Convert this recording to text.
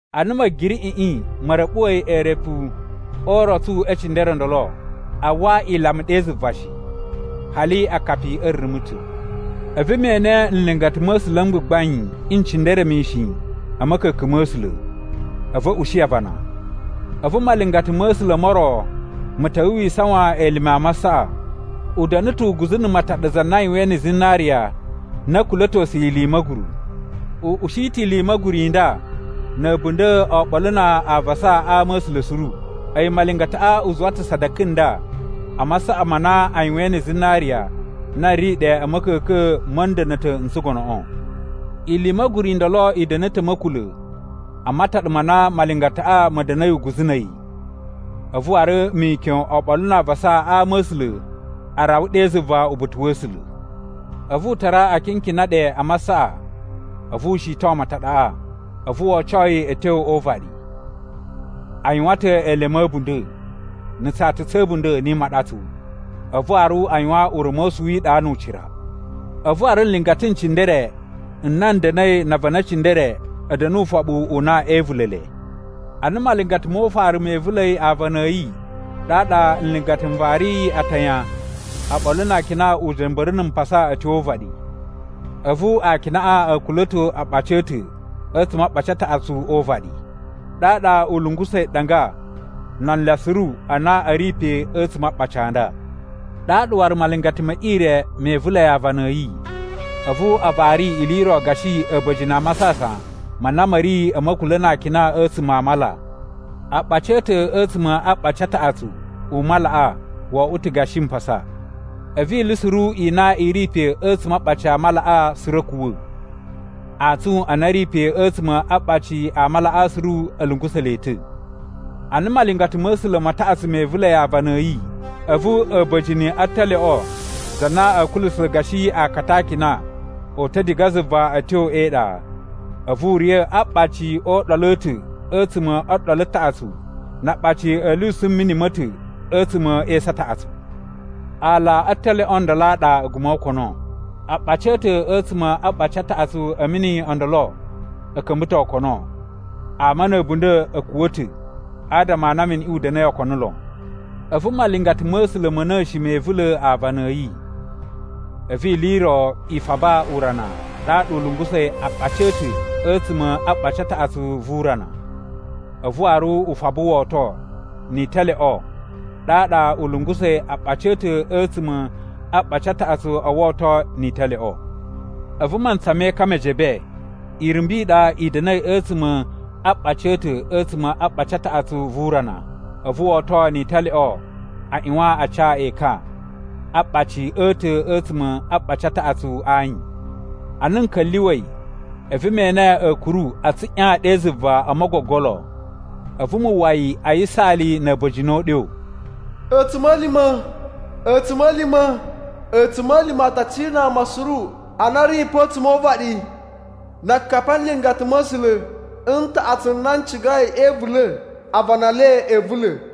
Ana Ma̱giriꞌiꞌi ma̱ ra̱ɓuwa̱i eerepu o urotsu e cindere o ndolo, a uwwa ilama ɗe zuva shi, hali akapi a̱ rumu ta̱. A̱vu me ene nlingata ma̱ A̱sula̱ m gbagbain n cindere mishin a̱ ma̱ka̱ka̱n ma̱ A̱sula̱, a̱vu a̱ ushi avana. A̱vu malingata ma̱ A̱sula̱ mo ro ma̱ ta̱wa̱ wi isawan elime a masaꞌa. U da̱na̱ ta̱ uguzu na̱ mataɗa za na a yuwain na̱ zinariya na a̱ kula̱tosuyi ili i ma̱guru. U ushi ta̱ ili i ma̱guru i nda na̱ a̱bunda̱ oɓolo na avasa a ama a̱ A̱sula̱ suru. A̱yi malingataꞌa u zuwa ta̱ sadaka nda a masaꞌa ma na a yuwain na̱ zinariya na ri ɗe a̱ ma̱ka̱ka̱n ma̱ nda̱na̱ta̱ n tsugonoꞌo. Ili i ma̱guru i ndolo i da̱na̱ ta̱ a̱ ma̱kula̱ a mataɗa ma na malingataꞌa ma̱ da̱na̱i uguzu na̱ a̱yi, a̱vu waru mikyon oɓolo na avasa a ama a̱ A̱sula̱ a rawa ɗe zuva uba̱ta̱ wa̱ A̱sula̱. A̱vu u tara akinkina ɗe a masaꞌa a̱vu u shiton mataɗaꞌa. A̱vu wo oco yi a̱ tyo o uvaɗi. A yuwan ta̱ elemu a̱ a̱bunda̱, na̱ tsata tsa̱ a̱bunda̱ ni imaɗatsu, a̱vu waru a yuwan ura̱mosu wi iɗa nu ucira. A̱vu waru nlingata n cindere n na n da̱na̱i na avana e cindere a̱ da̱na̱ ufoɓu u na ee ivula̱ le. Ana malingata mo ufaru me ivula̱i aavana a̱ yi, ɗaɗa nlingata n variyi atayan oɓolo na akina uja̱mba̱ru na̱ mpasa a̱ tyo o uvaɗi. A̱vu akinaꞌa a̱ kula̱to aaɓaci a̱ ta̱ a̱tsuma̱ a aɓaci a taꞌatsu o uvaɗi, ɗaɗa u lungusa̱i ɗanga na anlya suru a na a̱ ri pe a̱tsuma̱ a aaɓaci a nda. Ɗaɗa waru malingata me ire me ivula̱i aavana a̱ yi. A̱vu a vari ili i ro gashi a̱ba̱jini a masasan ma na ma̱ ri a̱ ma̱kula̱ na akina a̱tsuma̱ a mala. Aaɓaci a̱ ta̱ a̱tsuma̱ a aɓaci a taꞌatsu u malaꞌa wo oꞌwo ta̱ gashi mpasa. A̱vu ili suru i na i ri pe a̱tsuma̱ a aaɓaci a malaꞌa suru a̱ kuwa̱, antsun a na a̱ ri pe a̱tsuma̱ a aaɓaci a malaꞌa suru a̱ lungusa̱ le ta̱. Ana malingata ma̱ A̱sula̱ ma taꞌatsu me ivula̱i aavana a̱ yi, a̱vu a̱ba̱jini a talyoꞌo za na a̱ kulusa̱ gashi aakata a akina, o uta̱ diga zuva a̱ tyo e iɗa. A̱vu u riya̱ a aaɓaci o uɗolu a̱ ta̱ a̱tsuma̱ o ɗolu taꞌatsu na aaɓaci a̱ lyusu mini ma̱ ta̱ a̱tsuma̱ e esu a taꞌatsu. Aala a talyoꞌo ndolo a ɗa A̱guma̱ o Okono. Aaɓaci a̱ ta̱ a̱tsuma̱ aɓaci a taꞌatsu a̱ mini o ndolo a̱ ka̱mba̱ ta̱ okono. Ama na̱ a̱bunda̱ a̱ kuwa̱ ta̱ adama a na miniꞌi u da̱na̱i okono lon. A̱vu malingata ma̱ A̱sula̱ ma̱ na̱shi me ivula̱ aavana a̱ yi. A̱vu ili i ro i faba urana ɗaɗa u lungusa̱i aaɓaci a̱ ta̱ a̱tsuma̱ a aɓaci a taꞌatsu vu urana, a̱vu waru u faba woto ni italyoꞌo ɗaɗa u lungusa̱i aaɓaci a̱ ta̱ a̱tsuma̱ a aɓaci a taꞌatsu o woto ni italyoꞌo. A̱vu mantsa me ekan me jebe, irumbu i ɗa i da̱na̱i a̱tsuma̱ a aaɓaci a̱ ta̱ a̱tsuma̱ a aɓaci a taꞌatsu vu urana. A̱vu woto ni italyoꞌo a ꞌyuwan a ca ekan a aaɓaci a̱ ta̱ a̱tsuma̱ aɓaci a taꞌatsu a ayin. Ana n ka̱lyuwa̱i, a̱vu me ene a̱a̱kuru a tsuꞌyan ɗe zuva o mogogolo, a̱vu mu uwwa yi a yisaali na̱ a̱ba̱jini o uɗyo, “A̱tsuma̱lima̱! A̱tsuma̱lima̱! A̱tsuma̱lima̱ a ta cina ama suru a na a̱ ri pa a̱tsuma̱ o uvaɗi, na akapi a nlingata ma̱ A̱sula̱ n taꞌatsu n na n cigai e ivula̱ avana e le e ivula̱.”